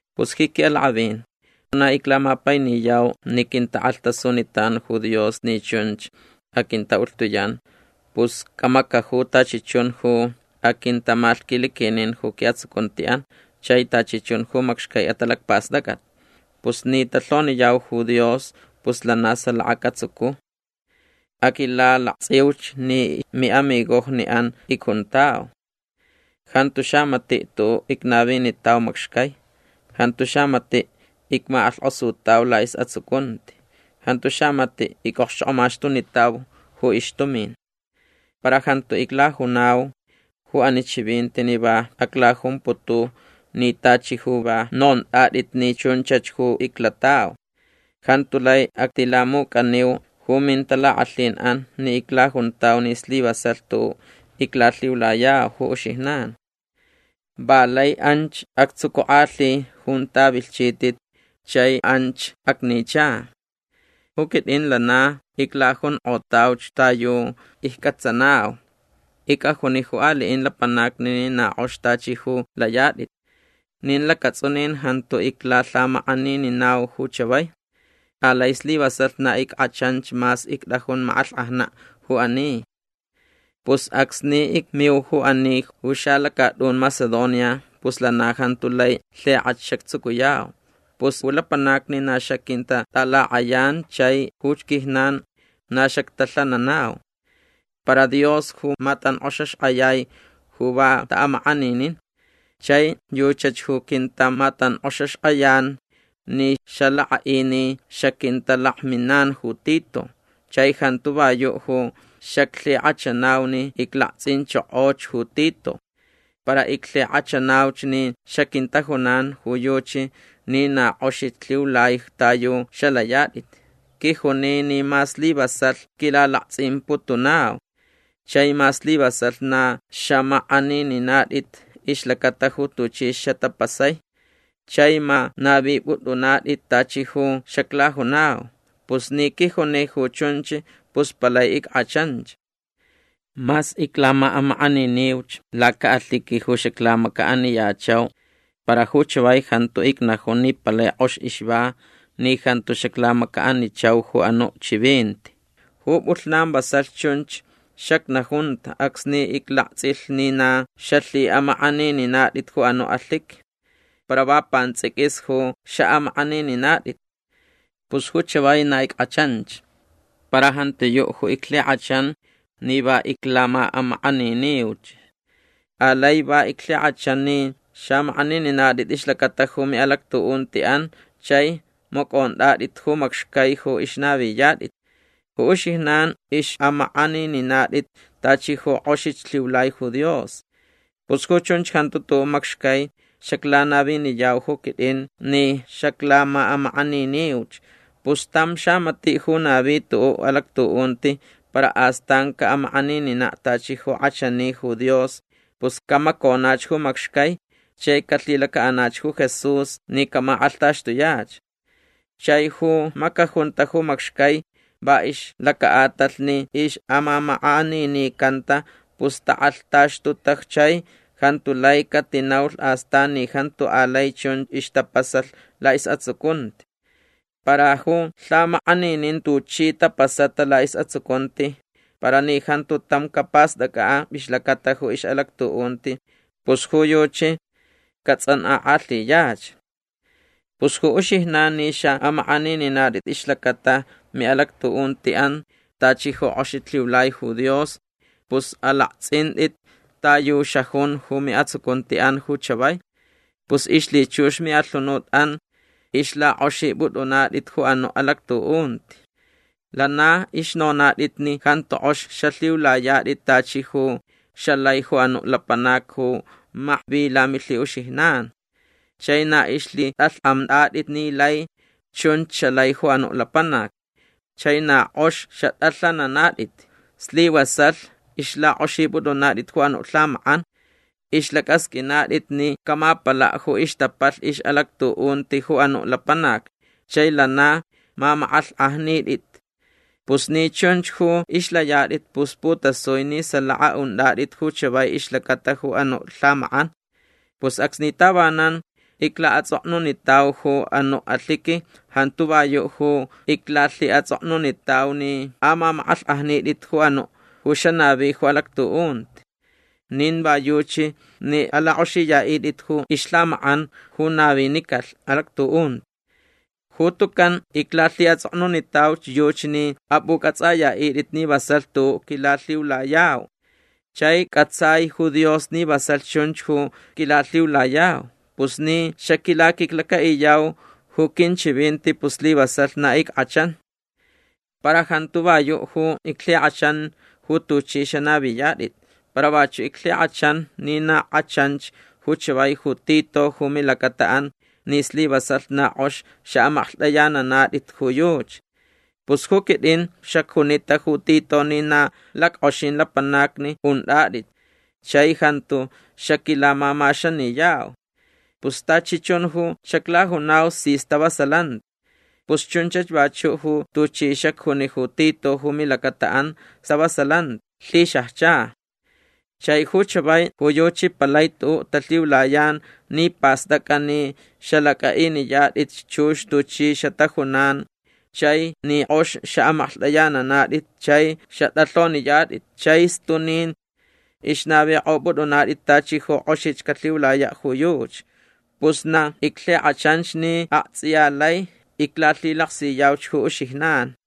Pus ji quiʼalakʼavin ju na iclamapainiyau ni quintakʼalhtasunitan ju Dios ni chunch aquintaʼulhtuyan pus camacaju tachi chun ju aquintamalhquiliquin ju quiʼatsucuntiʼan chai tachi chun ju macxcai atalacpastʼacʼat. Pus ni talhoniyau ju Dios pus lana salaka catsucu. Aquilalaktsʼiuch ni miʼamigojniʼan icjuntau. Jantu xamatiʼ tuʼuʼ icnavinitau macxcai. Jantu xamatiʼ icmakʼalhkʼosutau laʼisʼatsucunti. Jantu xamatiʼ icʼokxchokʼomaxtunitau ju ixtumin. Para jantu iclajunau ju ani chivinti ni va aclajumputu ni tachi ju va nontʼatʼit ni chunchach ju iclatau. Jantu lai actilamucʼaniu ju mintalakʼalhinʼan ni iclajuntau ni slivasalh tuʼuʼ iclalhiulayau ju uxijnan. Va lai anch actsucukʼalhi junta vilhchitʼit chai anch acnicha. Ju quitʼin lana iclajunkʼotauch ta yu iccʼatsanau. Icʼajuni ju aliʼin lapanacni ni na kʼox tachi ju layatʼit. Nin lacatsʼunin jantu iclalhamakʼanininau ju chavai. Alai slivasalh na ickʼachanch mas ictʼajun makʼalhkʼajnaʼ ju ani. Pus acsni icmiu ju ani ju xalacatʼun Macedonia pus lana jantu lai lhikʼach xactsucuyau. Pus ju lapanacni na xaquintatʼalakʼayan chai ju quijnan na xactalhananau. Para Dios ju matankʼoxaxkʼayai ju va taʼamakʼaninin. Chai yuchach ju quintamatankʼoxaxkʼayan ni xalakʼaʼi ni xaquintalakminan ju Tito. Chai jantu va yuʼ ju xaclhikʼachanau ni iclaktsʼinchokoch ju Tito. Para iclhikʼachanauch ni xaquintajunan ju yuchi ni na kʼoxich lhiulai ta yu xalayatʼit. Quijuni ni ma slivasalh quilalaktsʼimputunau. Chai ma slivasalh na xamakʼanininatʼit ixlacata ju tuchi xatapasai. Chai ma navipʼutʼunatʼit tachi ju xaclajunau. Pus ni quijuni ju chunch pus palai ickʼachanch. Mas iclamaʼamakʼaniniuch lacaʼalhiqui ju xaclamacaʼaniyachau para ju chavai jantu icnajun ni palai kʼox ixva ni jantu xaclamacaʼanichau ju anuʼ chivinti. Ju pʼulhnan vasalh chunch xacnajunta acsni iclaktsʼilh ni na xalhiʼamakʼanininatʼit ju anuʼ alhiqui. Para va pantsʼiquis ju xaʼamakʼanininatʼit. Pus ju chavai na ickʼachanch. Para jantiyuʼ ju iclhikʼachan ni va iclamaʼamakʼaniniuch. Alai va iclhikʼachan ni xamakʼanininatʼit ixlacata ju miʼalactuʼuntiʼan chai macʼontʼatʼit ju macxcai ju ixnaviyatʼit. Ju uxijnan ixʼamakʼanininatʼit tachi ju kʼoxich lhiulai ju Dios. Pus ju chunch jantu tuʼuʼ macxcai xaclanaviniyau ju quitʼin ni xaclamaʼamakʼaniniuch. Pus tam xamatiʼ ju navi tuʼuʼ alactuʼunti para astan caʼamakʼanininaʼ tachi ju kʼachani ju Dios pus camaconach ju macxcai chai calhilacaʼanach ju Jesús ni camakʼalhtaxtuyach. Chai ju macajunta ju macxcai va ixlacaʼatalh ni ixʼamamakʼaninicanta pus takʼalhtaxtuta chai jantu lai catinaulh astan ni jantu alai chun ixtapasalh laʼisʼatsucunti. Para ju lhamakʼaninin tuchi tapasata laʼisʼatsucunti para ni jantu tam capastʼacʼaʼ ixlacata ju ixʼalactuʼunti pus ju yuchi catsʼankʼakʼalhiyach. Pus ju uxijnan ni xaʼamakʼanininatʼit ixlacata miʼalactuʼuntiʼan tachi ju kʼoxich lhiulai ju Dios pus alaktsʼintʼit ta yu xajun ju miʼatsucuntiʼan ju chavai. Pus ixlhichux miʼalhunutʼan ixlakʼoxipʼutʼunatʼit ju anuʼ alactuʼunti. Lana ixnonatʼit ni jantu kʼox xalhiulayatʼit tachi ju xalai ju anuʼ lapanac ju makvi lamilhiʼuxijnan. Chai na ixlhitʼalhkʼamtʼatʼit ni lai chunch xalai ju anuʼ lapanac. Chai na kʼox xatʼalhanantʼit. Slivasalh ixlakʼoxipʼutʼunatʼit ju anuʼ lhamakʼan. Ixlacʼasqʼuinatʼit ni camapalaʼ ju ixtapalh ixʼalactuʼunti ju anuʼ lapanac chai lana mamakʼalhkʼajnitʼit. Pus ni chunch ju ixlayatʼit pus putasui ni salaka untʼatʼit ju chavai ixlacata ju anuʼ lhamakʼan. Pus acsni tavanan iclaʼatsʼoknunitau ju anuʼ alhiqui jantu va yuʼ ju iclalhiʼatsʼoknunitau ni amamakʼalhkʼajnitʼit ju anuʼ ju xanavi ju alactuʼunti. Nin va yuchi ni alakʼoxiyaʼitʼit ju ixlhamakʼan ju navinicalh alactuʼunti. Ju tucan iclalhiʼatsʼoknunitauch yuchi ni apʼucʼatsʼayaʼitʼit ni vasalh tuʼuʼ quilalhiulayau. Chai cʼatsai ju Dios ni vasalh chunch ju quilalhiulayau. Pus ni xaquilaquiclacaʼiyau ju quinchivinti pus slivasalh na ickʼachan. Para jantu va yuʼ ju iclhikʼachan ju tuchʼi xanaviyatʼit. Para vachuʼ iclhikʼachan ni na kʼachanch ju chavai ju Tito ju milacataʼan ni slivasalh na kʼox xaʼamaklhtʼayananatʼit ju yuchi. Pus ju quitʼin xacjunita ju Tito ni na lackʼoxin lapanacni untʼatʼit chai jantu xaquilamamaxaniyau. Pus tachi chun ju xaclajunau si stavasalanti. Pus chunchach vachuʼ ju tuchi xacjuni ju Tito ju milacataʼan stavasalanti lhixajcha. Chai ju chavai ju yuchi palai tuʼuʼ talhiulayan ni pastʼacʼa ni xalacʼaʼiniyatʼitch chux tuchi xatajunan chai ni kʼox xaʼamaklhtʼayananatʼit chai xatʼalhoniyatʼit chai stunin ixnavikʼopʼutʼunatʼit tachi ju kʼoxich calhiulayaʼ ju yuchi. Pus na iclhikʼachanch ni aktsʼiya lai iclalhilaksiyauch ju uxijnan.